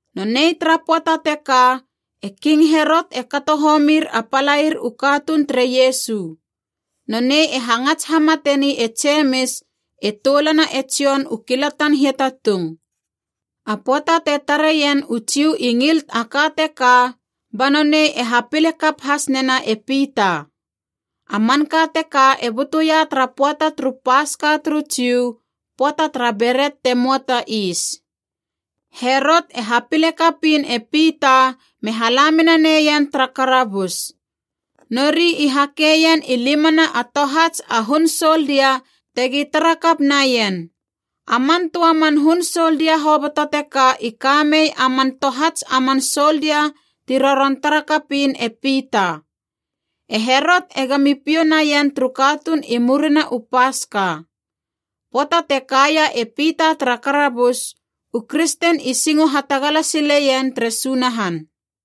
Nonei tara pöata teka e King Herot e kato homir a palair u katuun tere Iesu. Nonei e hangats hamateni e Jemis e toulana e Jon u kilatan hiatatung. A pöata te tareien u Jiu i ngil a ka teka, ba nonei e hapile kap has nena e Pita. (A manka teka e butuia tara pöata turu Paska turu Jiu, pöata tara Beret te möa ta Is.) Herot e hapile kapiin e Pita me hala mena neien tara karabus. Nori i hakeien i limana a tohats a hun soldia tegi tara kap naien. A man töa man hun soldia hoboto teka i ka mei a man tohats a man soldia ti roron tara kapiin e Pita. E Herot egami piou naien turu katuun i murina u Paska. Pöata te kaia e Pita tara karabus, u kristen i singo hatagala sileien tere Sunahan.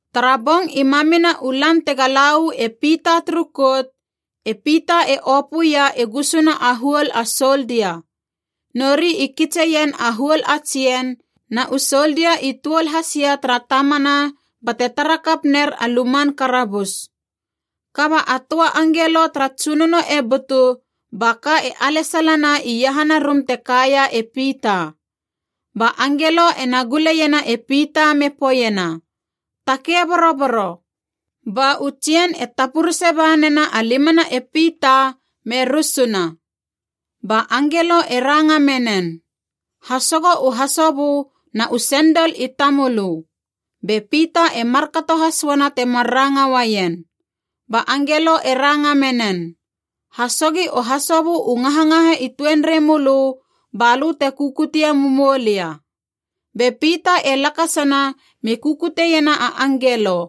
Tara bong i mamina u lan tega la uu e Pita turu kout, e Pita e opöia i gusuna a huol a soldia. Nori i kitseien a huol a tsien, na u soldia i tuol hasia tara tamana bate tara kap ner a luman karabus. Kaba a töa angelo tara Tsunono e butu, ba ka e alesalana iahana rum te kaia e Pita. Ba angelo ena guleiena e Pita me poeiena, “Takei boroboro.” Ba u tsien e tapurese ba nena a limana e Pita me rusuna. Ba angelo e ranga menen, “Hasogo u hasobö na u sendol i tamölö.” Be Pita e markato has uana temar ranga uaien. Ba angelo e ranga menen, “Hasogi u hasobö u ngahangaha i tuenrei mölö balö te kukutie mumou lia.” Be Pita e lakasana me kukutiena a angelo.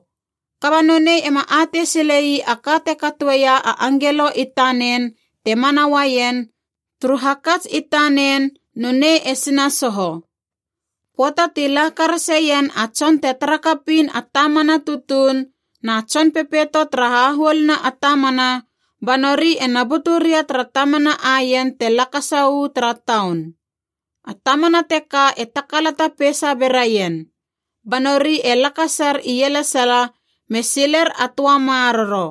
Kaba nonei ema atei sile ii a ka te katoeia a angelo i tanen te mana uaien, turu hakats i tanen nonei e sinasoho. Pöata ti la karaseien a tson te tara kapiin a tamana tutuun na tson pepeito tara hahuoluna a tamana, ba nori ena butu ria tara tamana aien te lakasa uu tara taun. A tamana teka e takalata peisa beraien. Ba nori e lakasar ielesala me siler a töa maroro.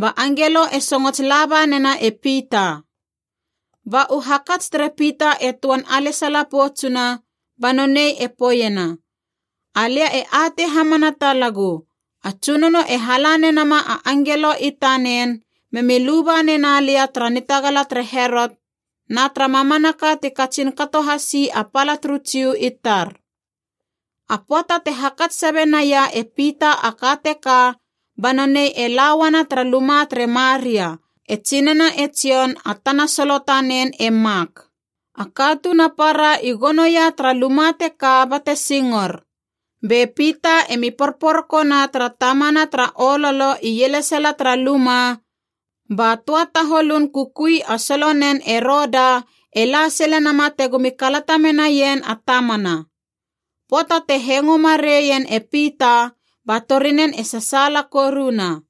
Ba angelo e songots laba nena e Pita. Ba u hakats tere Pita e töan alesala poutsuna, ba nonei e poeiena, “Alia e atei hamana talagu, a Tsunono e hala nenama a angelo i tanen memi luba nena lia tara nitagala tere Herot na tara mamanaka ti katsin kato hasi a pala turu Jiu i tar.” A pöata te hakats sabe naia e Pita a ka teka ba nonei e la uana tara luma tere Maria, e tsinana e Jon a tana solo tanen e Mak. A katuun a para i gonoia tara luma teka bate singor. Be Pita emi porporokona tara tamana tara ololo ielesala tara luma, ba töa taholun kukui a solonen e Roda e la sile nama tegomi kalata menaien a tamana. Pöata te hengo mareien e Pita, ba torinen e sasaala koruna.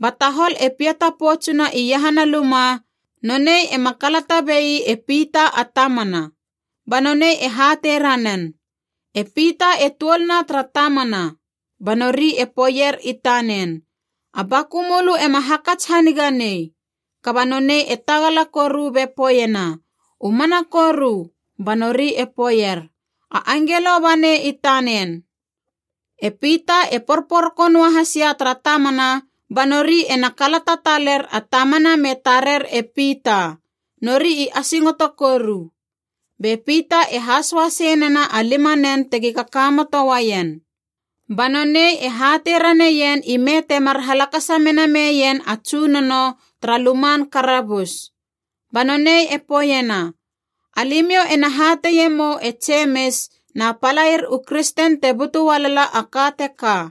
Ba tahol e piata poutsuna iahana luma, nonei ema kalata bei e Pita a tamana! Ba nonei e hatei ranen, “E Pita e tuolna tara tamana!” Ba nori e poeier i tanen, “A baku mölö ema hakats haniga nei!” Kaba nonei e tagala koru be poeiena, “U mana koru!” Ba nori e poeier, “A angelo banei i tanen.” E Pita e porporoko noa hasia tara tamana, ba nori ena kalata taler a tamana me tarer e Pita, nori i asingoto koru. Be Pita e hasoa sei nena a limanen tegi kakamoto uaien. Ba nonei e hatei raneien ime temar halakasa mena meien a Tsunono tara luman karabus. Ba nonei e poeiena, “Alimiou ena hateie mou e Jemis na palair u kristen te butu ualala a ka teka.”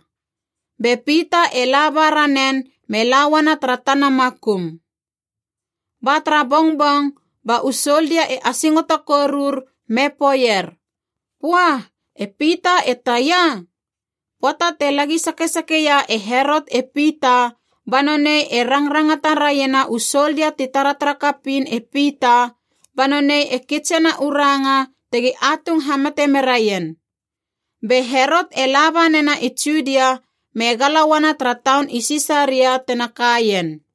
Be Pita e laba ranen me la uana tara tana makum. Ba tara bongbong, ba u soldia e asingoto korur, me poeier, “Pua, e Pita e taia?” Pöata te lagi sakesakeia e Herot e Pita ba nonei e rangrangata raiena u soldia ti taratara kapiin e Pita, ba nonei e kitsena u ranga tegi atung hamate meraien. Be Herot e laba nena i Judia me gala uana tara taun i Sisaria tena kaien.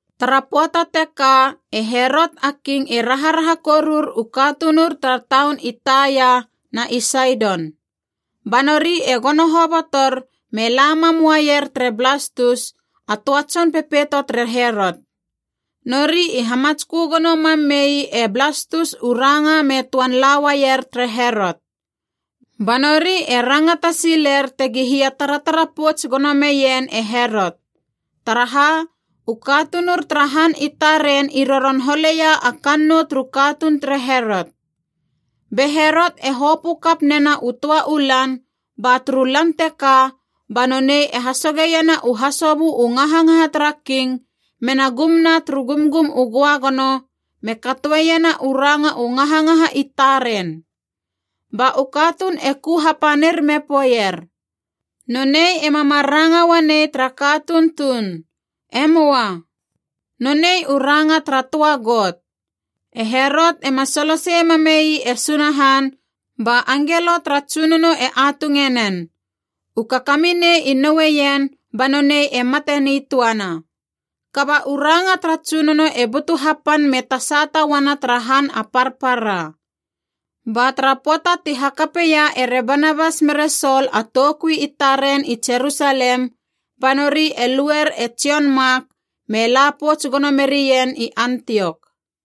Tara pöata teka e Herot a King e raharaha korur u katunur tara taun i Taia na i Saidon. Ba nori e gono hobotor me la mam uaier tere Blastus, a töa tson pepeito tere Herot. Nori i hamatskö gono mam mei e Blastus u ranga me töan la uaier tere Herot. Ba nori e rangata siler tegi hia taratara pouts gono meien e Herot. Taraha, u katunur tara han i taren i roron holeia a kannou turu katuun tere Herot. Be Herot e hopö kap nena u töa u lan, ba turu lan teka ba nonei e hasogeiena u hasobö u ngahangaha tara king, mena gumna turu gumgum u göagono, me katoena u ranga u ngahangaha i taren. Ba u katuun e ku hapanir me poeier, “Nonei ema mar ranga uanei tara katuun tuun! E möa. Nonei u ranga tara töa got!” E Herot ema solosei mamei e Sunahan, ba angelo tara Tsunono e atunge nen. U kakaminei i noueien, ba nonei e mate nitöana. Kaba u ranga tara Tsunono e butu hapan me tasata uana tara han a parpara. Ba tara pöata ti hakapeia ere Banabas mere Sol a toukui i taren i Jerusalem, ba nori e luer e Jon Mak, me la pouts gono merien i Antiok.